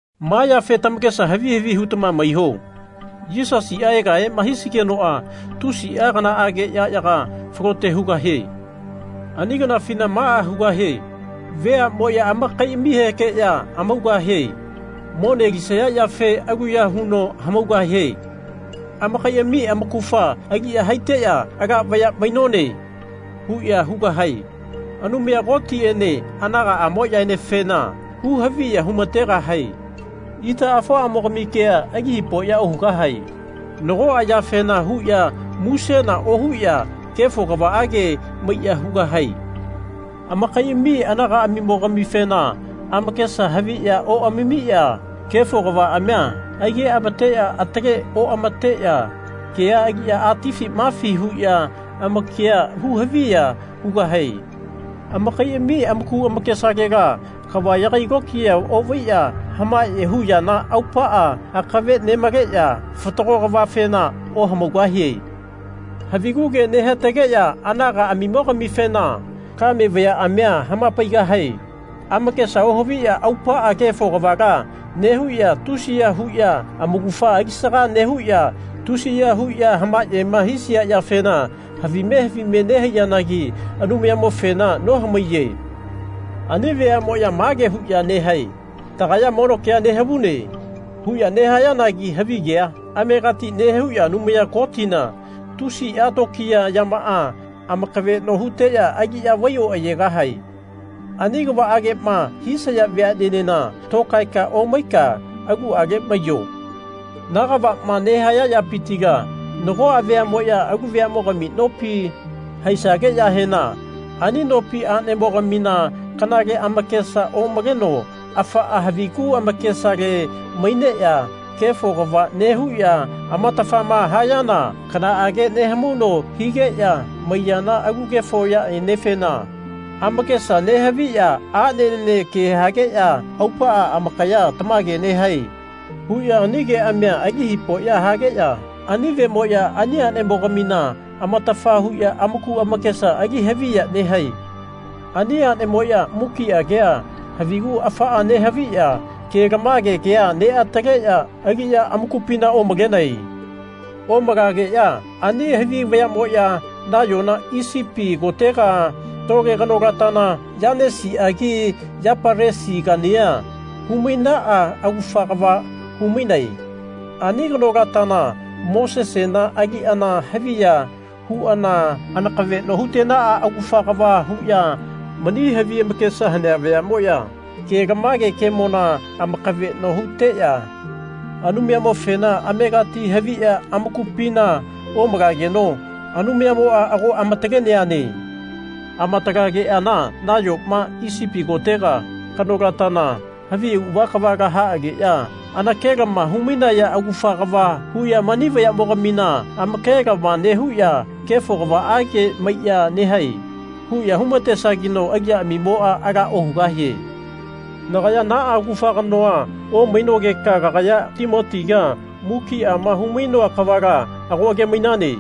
Ma yafe tamakesa havi havi hutama maiho. Yisasia egahema hisigenoa tusia kanaage yayaga falote hugahie. Ani kanafina maa hugahae. Veamoya amakaiamihekeya hamaugahie. Mone alisaya yafe aluya huno hamaugahie. Amakaiami amaugafa aliya haiteya Ala vaya mainone. huya hugahae. Anumaya Kotiene anagaamoyaenefena hu haviya humategahae. Itaamo-afoamogami kea ali hipoya ohugahae. Nagoa yafena huya musena ohuya kefo kavaage maiya hugahae. Amakaiami anagaamimo-gamifena amakesa haviya oamamiya kefo kavaamia aige-amateya atale oamateya kea aliya atifi mafi huya amakia hu haviya hugahae. Amakaiami amaku amakesalela kava yagai lokiya ovaiya hamaye hu yana aupaa akave nemaleya fatago kavafena ohamaugahie. Havigu ke nehatageya anagamimo-gamifena kame vayaamia hamapaigahae. Amakesa ohaviya aupaa kefo kavala nehuya tusiya huya amaugafa alisaga nehuya tusiya huya hamayema hisia yafena havime havime nehaiyanagi Anumayamofena nohamaiye. Ani veamoya mage huya nehae Tagaya mono kea nehavune. huya nehayanagi havigea amegati nehuya Anumaya Kotina tusia tokiya yamaa amakaveno huteya aliya vai oayegahae. Ani kavaagema hisaya veanenena tokaeka omaika aluale maiyo. Na kavama nehaya vayapitila nagoa vayamoya alu veamogami nopi haisageyahena ani nopi anemogamina kanale amakesa omaleno afaa havigu amakesale maineya kefo kava nehuya amatafama hayana kanaage nehamauno higeya maiyana alu kefo yaenefena amakesa nehaviya anene ke hageya aupaa amakaya Tamage nehae. huya ani keamia ali hipoya hageya ani vemoya ani anemo-gamina amatafa huya amaku amakesa ali haviya nehae. Ani anemoya mukia kea havigu afaa nehaviya kelamage kea neataleya aliya amakupina omalenae. Omalageya ani havi vayamoya nayona Isipiti kotega tole kanolatana Yanesiagi Yapalesigania humainaa augafa kava humainae. Ani kanolatana Mosesena aliana havi ya huana anakaveno hutenaa augafa kava huya mani havi amakesa hanea vayamoya kelamage kemona amakaveno huteya Anumayamofena amegati haviya amakupina omalageno Anumayamoa ago ama-taleneane. Amatalegeana nayoma Isipiti kotega kanolatana havi auava kavala haageya anakelama humainaya augafa kava huya mani vayamo-gamina amakelama nehuya Kefo kavaage maiya nehae. huya humatesageno aliyaamimoa ala ohugahie. Nagaya naa augafa kanoa omainogeka kagaya Timotiga mukiama humainoa kavala ago age-mainane.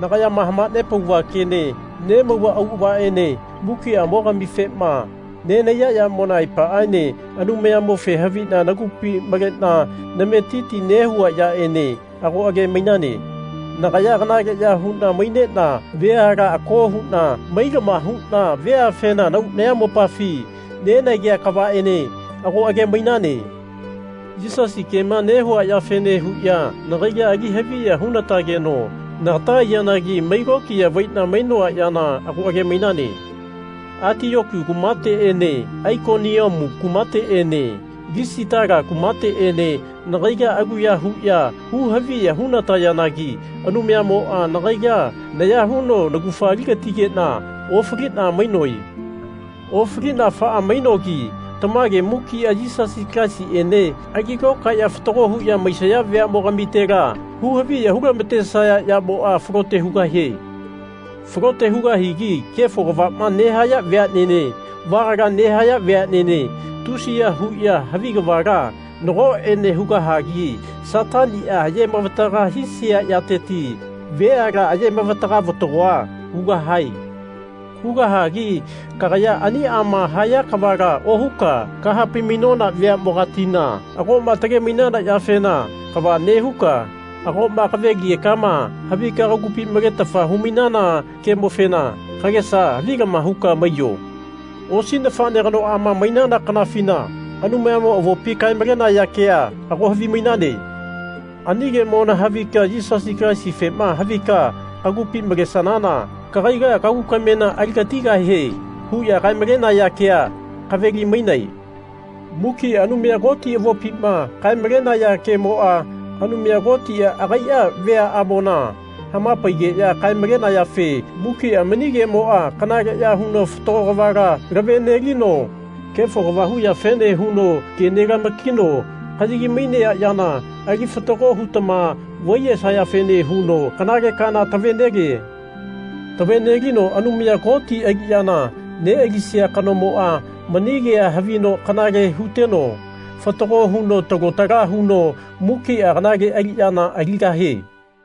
Nagayama hamanepauva kene nemauva auavaene mukiamo-gamifema nenahaiya yamona aepaaene Anumayamofe havina nagupi malena nametiti nehua yaene ago age-mainane. Nagaya kanaleya huna mainena veala ako huna mailama huna veafena nahau nayamopafi nenagea kavaene ago age-mainane. Yisasi kema nehua yafene huya nagaila ali haviya hu-natageno nagata aiyanagi mai lokiya vaina mainoa yana ago age-mainane. Atiyoku kumateene Aikoniamu kumateene Lisitala kumateene nagaila aluya huya hu haviya hunatayanagi Anumayamoa nagaila naya huno naugafa ali-gatigena ofalina mainoe. Ofalina afaa mainogi tamage mukia Yisasi Kalaisiene ali lokaeya fatago huya maisaya veamo-gamitela hu haviya hulamatesaya yamoa falote hugahie. Falote hugahigi kefo kavama nehaya veanene vagala nehaya veanene tusiya huya havi kavala nagoene hugahagi Satania aye-mavataga hisia yateti veala aye-mavataga vatagoa hugahae. Hugahagi kagaya aniama haya kavala ohuka kahapai-mainona veamogatina agoma tage-mainana yafena kava nehuka agoma kave-ligekama havika kagupi maletafa humainana kemofena kagesa havilama huka maiyo. Osi nafane kanoama mainana kanafina Anumayamo avopima kae-malenaya kea ago havimainane. Ani kemona havika Yisasi Kalaisifema havika kagupi malesanana kagaila kagu kamena aligatigahie huya kae-malenaya kea kave-limainae. Mukia Anumaya Koti avopima kae-malenaya kemoa Anumaya Kotia agaia veaamona hamapaigeya kae-malenayafe mukia mani kemoa kanaleya huno fatago kavala lave-nelino kefo kava hu yafene huno ke nelama-kino kayagi-mainea yana ali fatago hutama vaiyesayafene huno kanale kaana tave-nelie. Tave-nelino Anumaya Koti aliyama nealisia kanomoa mani kea havino kanale huteno fatago huno talo tala huno mukia kanale aliyana aligahie.